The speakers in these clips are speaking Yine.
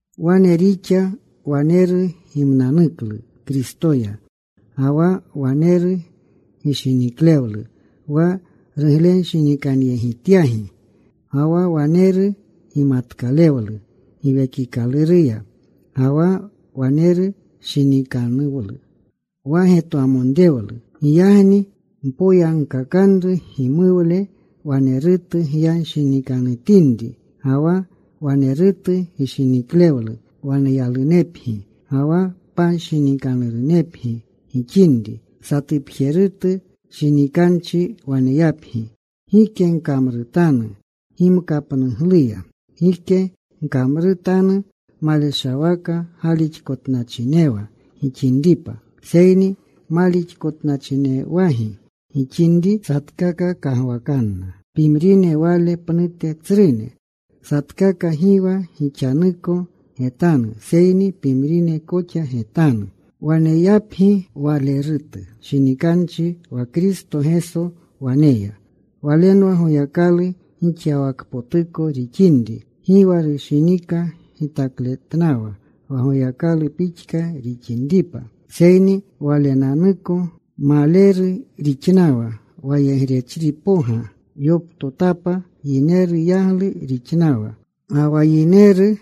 Wane rixa. Waneru gimnanuklu Kristoya, ga wa waneru gishiniklewlu wa ruglenshinikanyegityagi, ga wa waneru gimatkaklewlu Giwekikaluruya, ga wa waneru shinikanuwlu ga wa getwamonrewlu. Giyagni mpoyankakanru numuwle, walerutu gyanshinikanutinri, ga wa walerutu gishiniklewlu waneyalunepgi, ga wa panshinikanurunepgi gixinri. Satupjerutu shinikanchi waneyapgi. Gike gkamrutanu gimkapnugluya. Gike gkamrutanu maleshawaka galixkotnachinewa gixinripa. Seyni malixkotnachinewagi gixinri satkaka kagwakanna pimrine wale pnute tsrune. Satkaka gi wa gixanuko getanu, seyni pimrine koxa getanu. Waneyapgi walerutu shinikanchi wa Kristo Geso waneya. Walenwa Goyakalu gixyawakpotuko rixinri, gi wa rushinika gitakletnawa wa Goyakalu pixka rixinripa. Seyni Walenanuko maleru rixnawa. Wayegrechripoga yoptotapa. Yineru yaglu rixnawa. Ga wa yineru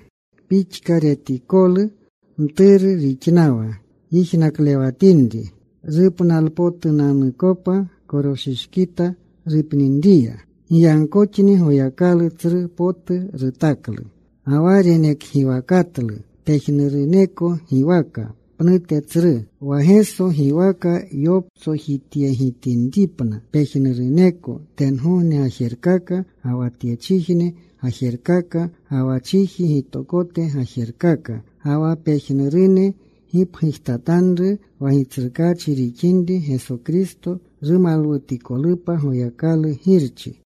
pixka retikolu, mturu rixnawa yijnaklewatinri rupnalpotunanukopa, koroshishkita rupninriya. Giyagkoxni Goyakalu tsru potu rutaklu. Ga wa renekgiwakatlu pejnuruneko giwaka pnute tsru. Wa Geso giwaka yoptsojityegitinripna pejnuruneko tengogne gajerkaka, ga wa tyechijne gajerkaka, ga wa chiji gitokote gajerkaka. Ga wa pejnurune gipgujtatanru wa Gitsrukaachi rixinri Geso Kristo, rumalwutikolupa Goyakalu Girchi.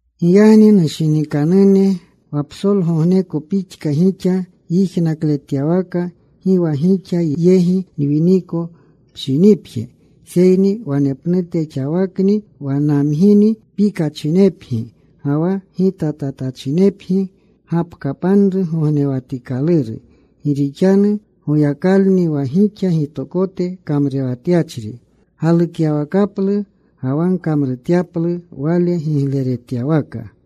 Giyagni, nushinikanune, wa psolgogneko pixka gixa yijnakletyawaka, gi wa gixa yegi nwiniko pshinipje, seyni wanepnute xawakni wa namgini, pikachinepgi ga wa gitatatachinepgi gapkapanru gognewatikaluru. Gi rixanu Goyakalni wa gixa gitokote kamrurewatyachri galukyawakaplu ga wa gkamrutyaplu Wale gigleretyawaka.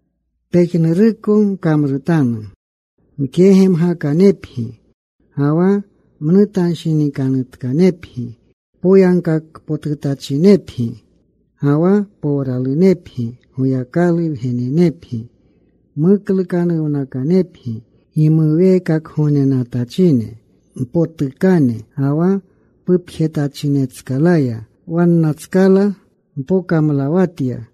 Pejnuruko gkamrutanu mkegemgakanepgi ga wa mnutanshinikanutkanepgi. Poyagkakpotutachinepgi ga wa powralunepgi. Goyakalu wgenenepgi muklukanuwnakanepgi gimuweekakgognenatachine mpotukane ga wa pupjetachinetskalaya. Wannatskala mpokamlawatya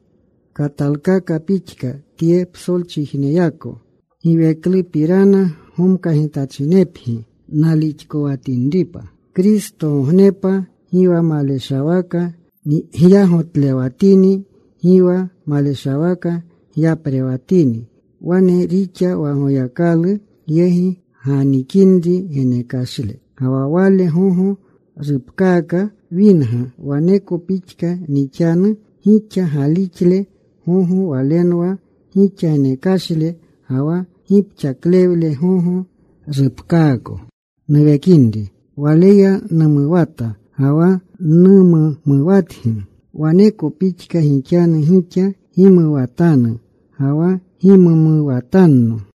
katalkaka pixka tye psolchijneyako. Giweklupirana gomkagitachinepgi, nalixkowatinripa Kristogognepa, gi wa maleshawaka nyagotlewatini, gi wa maleshawaka nyaprewatini. Wane rixa, wa Goyakalu yegi ganikinri genekashle, ga wa wale gogo rupkaaka winga, waneko pixka nixanu. Gixa galixle gogo, walenwa gixa genekashle ga wa gipxaklewle gogo, rupkaako nuwekinri. Waleya numuwata ga wa numumuwatgi. Waneko pixka gixanu gixa. Gimuwatanu ga wa gimumuwatanno.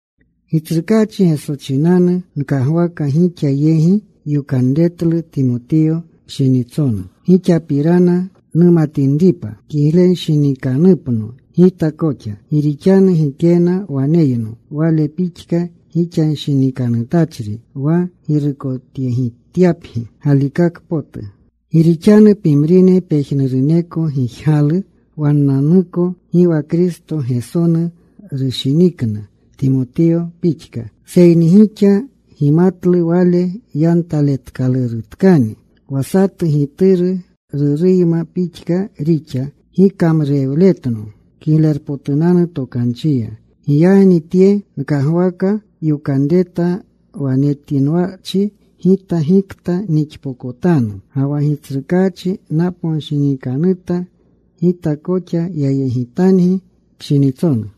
Gitsrukaachi Geso chinanu nkagwaka gixa yegi yokanretlu Timotiyo pshinitsonu, gixapirana numatinripa, kiglenshinikanupno gita koxa. Gi rixanu gikena waneyno wale pixka gixanshinikanutachri wa girukotyegityapgi galikaka potu. Gi rixanu pimrine pejnuruneko gijgalu wannanuko. Gi wa Kristo Gesonu rushinikna, Timotiyo pixka. Seyni gixa gimatlu wale yantaletkalurutkani, wa satu gituru ruruyma pixka rixa gikamrurewletno Kiglerpotunanu Tokanchiya. Giyagni tye nkagwaka yokanreta wa netinwachi gita gikta nixpokotanu. Ga wa Gitsrukaachi naponshinikanuta gita koxa yayegitangi pshinitsonu.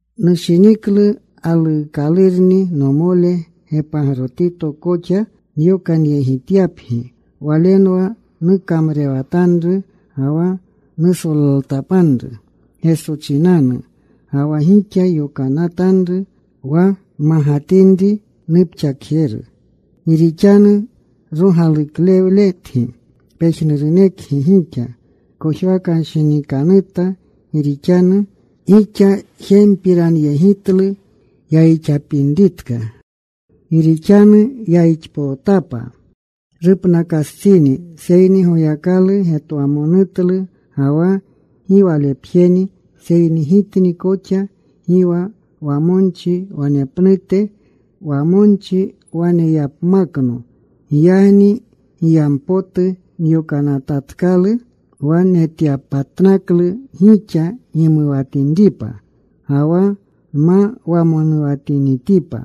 Nushiniklu galuukalurni nomole Gepagrotito koxa nyokanyegityapgi. Walenwa nukamrurewatanru ga wa nusolaltapanru Geso chinanu ga wa gixa yokanatanru wa nmagatinri nupxakjetjeru. Gi rixanu rogaluklewletgi pejnurunekgi gixa. Kojwakanshinikanuta gi rixanu gixa jempiranyegitlu yayixapinritka. Gi rixanu yayixpootapa. Rupnakastsini. Seyni Goyakalu getwamonutlu, ga wa gi walepjeni seyni gitni koxa. Gi wa wamonchi wanepnute wamonchi waneyapmakno. Giyagni giyampotu nyokanatatkalu wa getyapatnaklu gixa, gimuwatinripa, ga wa nma wamonuwatinitipa.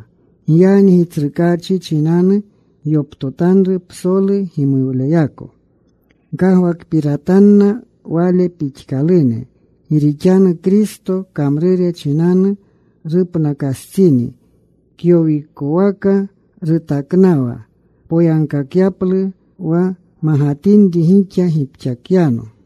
Giyagni Gitsrukaachi chinanu gyoptotanru psolu gimuwleyako. Gkagwakpiratanna wale pixkalune. Gi rixanu Kristo kamrure chinanu rupnakastsini. Kyowikowaka rutaknawa poyagkakyaplu wa magatinri gixa gipxakyano.